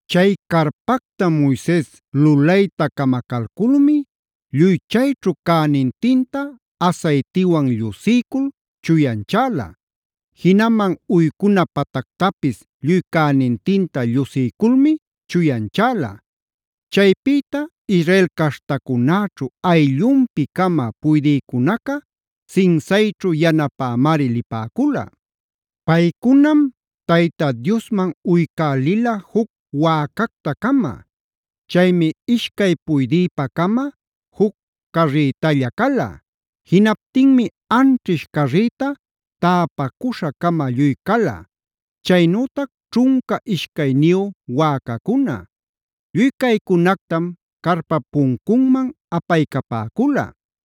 Chay carpacta Moises lulayta camacalculmi lluy chayćhu cänintinta asaytiwan llusiycul chuyanchäla. Jinaman uycuna patactapis lluy cänintinta llusiyculmi chuyanchäla. Chaypïtam Israel caśhtacunäćhu ayllunpi-cama puydïcunaca, sinsayćhu yanapämari lipäcula. Paycunam Tayta Diosman uycälila juc wäcacta-cama. Chaymi ishcay puydïpa-cama juc carrïtalla cala. Jinaptinmi anćhish carrita täpacuśha-cama lluy cala, ćhunca ishcayniyu wäcacuna. Lluy caycunactam carpap puncunman apaycapäcula.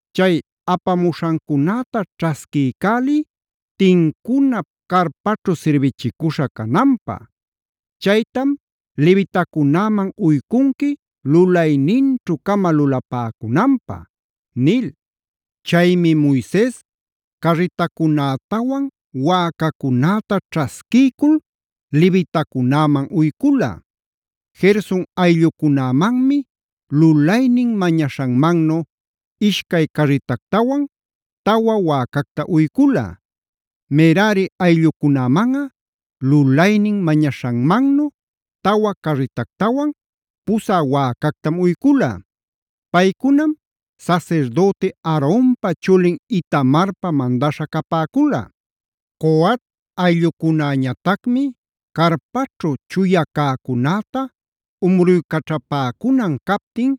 “Chay apamuśhancunäta ćhasquïcäliy tincuna carpaćhu sirbichicuśha cananpä. Chaytam levitacunäman uycunqui lulayninćhu-cama lulapäcunanpä” nil. Chaymi Moises carritacunätawan wäcacunäta ćhasquiycul levitacunäman uycula. Gerson ayllucunämanmi lulaynin mañaśhanmannu ishcay carritactawan tawa wäcacta uycula. Merari ayllucunämanꞌa lulaynin mañaśhanmannu tawa carritactawan pusä wäcactam uycula. Paycunam sasirdüti Aaronpa chulin Itamarpa mandaśha capäcula. Coat ayllucunäñatacmi carpaćhu chuya cäcunäta umruycaćhapäcunan captin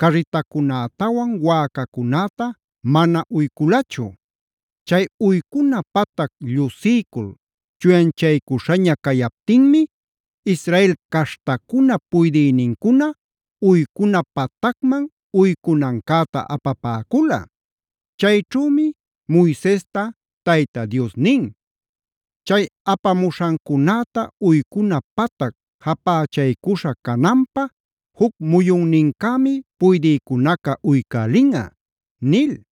carritacunätawan wäcacunäta mana uyculachu. Chay uycuna patac llusiycul chuyanchaycuśhaña cayaptinmi Israel caśhtacunap puydïnincuna uycuna patacman uycunancäta apapäcula. Chayćhümi Moisesta Tayta Dios nin: “Chay apamuśhancunäta uycuna patac japächaycuśha cananpä juc muyunnincämi puydïcunaca uycälinꞌa” nil.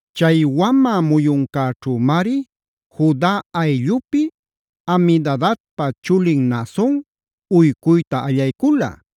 Chay wamä muyuncäćhümari Juda ayllupi Aminadabpa chulin Naason uycuyta allaycula.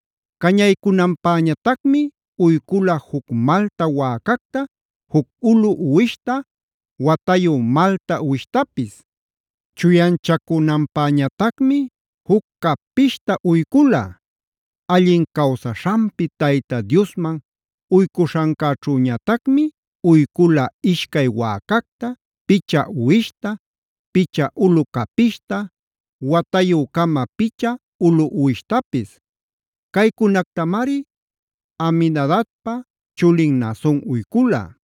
Cañaycunanpäñatacmi uycula juc malta wäcacta, juc ulu uwishta, watayu malta uwishtapis. Chuyanchacunanpäñatacmi juc capishta uycula. Allin cawsaśhanpi Tayta Diosman uycuśhancäćhüñatacmi uycula ishcay wäcacta, picha uwishta, picha ulu capishta, watayü-cama picha ulu uwishtapis. Caycunactamari Aminadabpa chulin Naason uycula.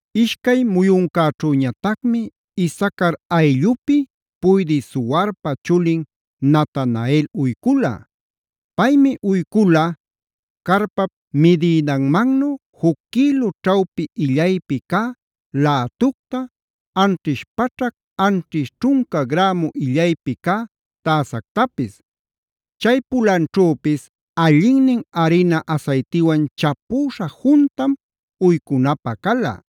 Ishcay muyuncäćhüñatacmi Isacar ayllupi puydï Zuarpa chulin Natanael uycula. Paymi uycula: carpap midïdanmannu juc quïlu ćhawpi illaypi cä lätucta, anćhish paćhac anćhish ćhunca grämu illaypi cä täsactapis. Chay pulanćhüpis allinnin arina asaytiwan chapüśha juntam uycunapä cala.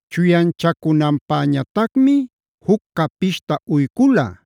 Chuyanchacunanpäñatacmi juc capishta uycula.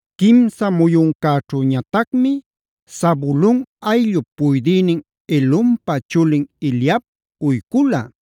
Quimsa muyuncäćhüñatacmi Zabulon ayllup puydïnin Helonpa chulin Eliab uycula.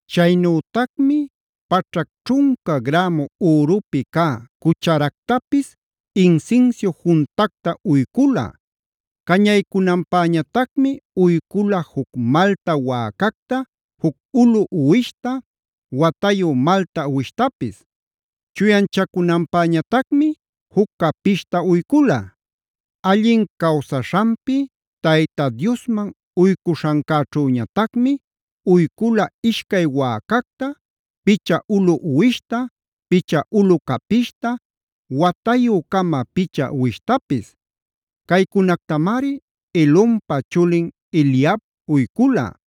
Chaynütacmi paćhac ćhunca grämu ürupi cä cucharactapis insinsiu juntacta uycula. Cañaycunanpäñatacmi uycula juc malta wäcacta, juc ulu uwishta, watayu malta uwishtapis. Chuyanchacunanpäñatacmi juc capishta uycula. Allin cawsaśhanpi Tayta Diosman uycuśhancäćhüñatacmi uycula ishcay wäcacta, picha ulu uwishta, picha ulu capishta, watayü-cama picha uwishtapis. Caycunactamari Helonpa chulin Eliab uycula.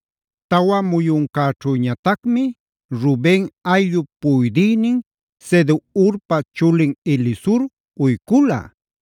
Tawa muyuncäćhüñatacmi Ruben ayllup puydïnin Sedeurpa chulin Elisur uycula.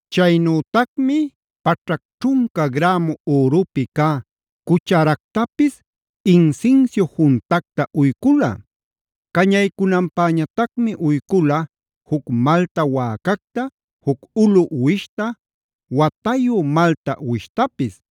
Chaynütacmi paćhac ćhunca grämu ürupi cä cucharactapis insinsiu juntacta uycula. Cañaycunanpäñatacmi uycula juc malta wäcacta, juc ulu uwishta, watayu malta uwishtapis.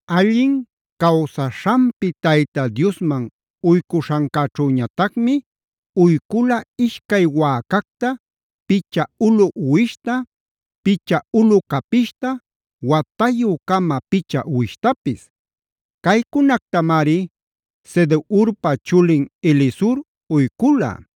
Allin cawsaśhanpi Tayta Diosman uycuśhancäćhüñatacmi uycula ishcay wäcacta, picha ulu uwishta, picha ulu capishta, watayü-cama picha uwishtapis. Caycunactamari Sedeurpa chulin Elisur uycula.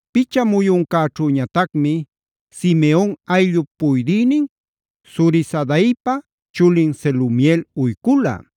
Picha muyuncäćhüñatacmi Simeon ayllup puydïnin Zurisadaipa chulin Selumiel uycula.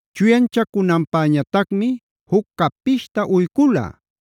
Chuyanchacunanpäñatacmi juc capishta uycula.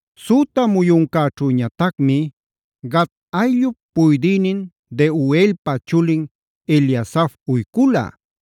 Süta muyuncäćhüñatacmi Gad ayllup puydïnin Deuelpa chulin Eliasaf uycula.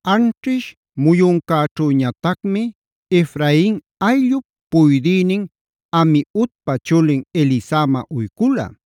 Anćhish muyuncäćhüñatacmi Efrain ayllup puydïnin Amiudpa chulin Elisama uycula.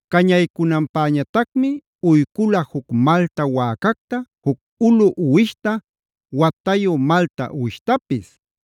Cañaycunanpäñatacmi uycula juc malta wäcacta, juc ulu uwishta, watayu malta uwishtapis.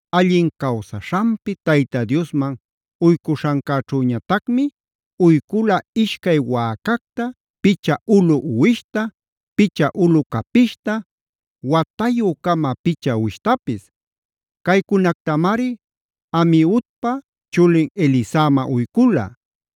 Allin cawsaśhanpi Tayta Diosman uycuśhancäćhüñatacmi uycula ishcay wäcacta, picha ulu uwishta, picha ulu capishta, watayü-cama picha uwishtapis. Caycunactamari Amiudpa chulin Elisama uycula.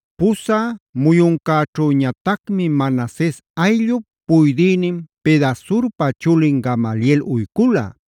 Pusä muyuncäćhüñatacmi Manases ayllup puydïnin Pedasurpa chulin Gamaliel uycula.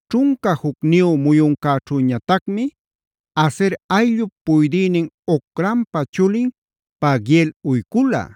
Ćhunca jucniyu muyuncäćhüñatacmi Aser ayllup puydïnin Ocranpa chulin Pagiel uycula.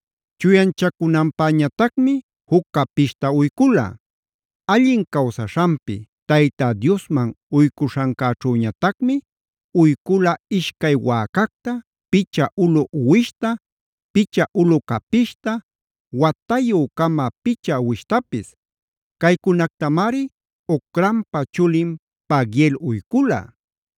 Chuyanchacunanpäñatacmi juc capishta uycula. Allin cawsaśhanpi Tayta Diosman uycuśhancäćhüñatacmi uycula ishcay wäcacta, picha ulu uwishta, picha ulu capishta, watayü-cama picha uwishtapis. Caycunactamari Ocranpa chulin Pagiel uycula.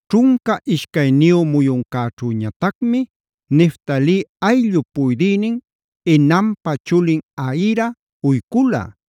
Ćhunca ishcayniyu muyuncäćhüñatacmi Neftali ayllup puydïnin Enanpa chulin Ahira uycula.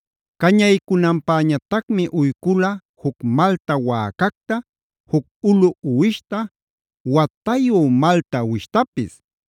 Cañaycunanpäñatacmi uycula juc malta wäcacta, juc ulu uwishta, watayu malta uwishtapis.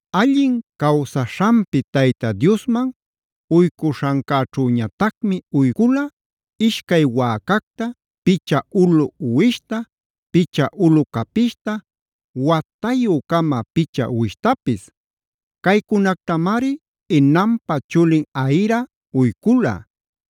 Allin cawsaśhanpi Tayta Diosman uycuśhancäćhüñatacmi uycula ishcay wäcacta, picha ulu uwishta, picha ulu capishta, watayü-cama picha uwishtapis. Caycunactamari Enanpa chulin Ahira uycula.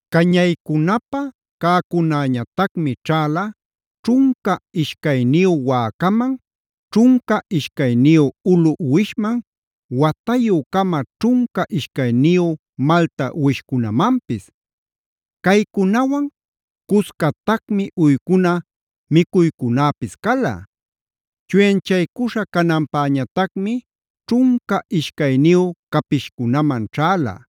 Cañaycunapä cäcunäñatacmi ćhäla: ćhunca ishcayniyu wäcaman, ćhunca ishcayniyu ulu uwishman, watayü-cama ćhunca ishcayniyu malta uwishcunamanpis. Caycunawan cuscatacmi uycuna micuycunäpis cala. Chuyanchaycuśha cananpäñatacmi ćhunca ishcayniyu capishcunaman ćhäla.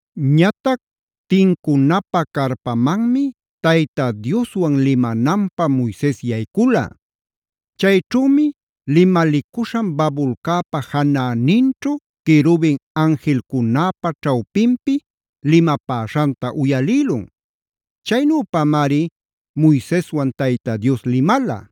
Ñatac tincunapä carpamanmi Tayta Dioswan limananpä Moises yaycula. Chayćhümi limalicuśhan babulcäpa janäninćhu querubin anjilcunäpa ćhawpinpi limapäśhanta uyalïlun. Chaynüpamari Moiseswan Tayta Dios limala.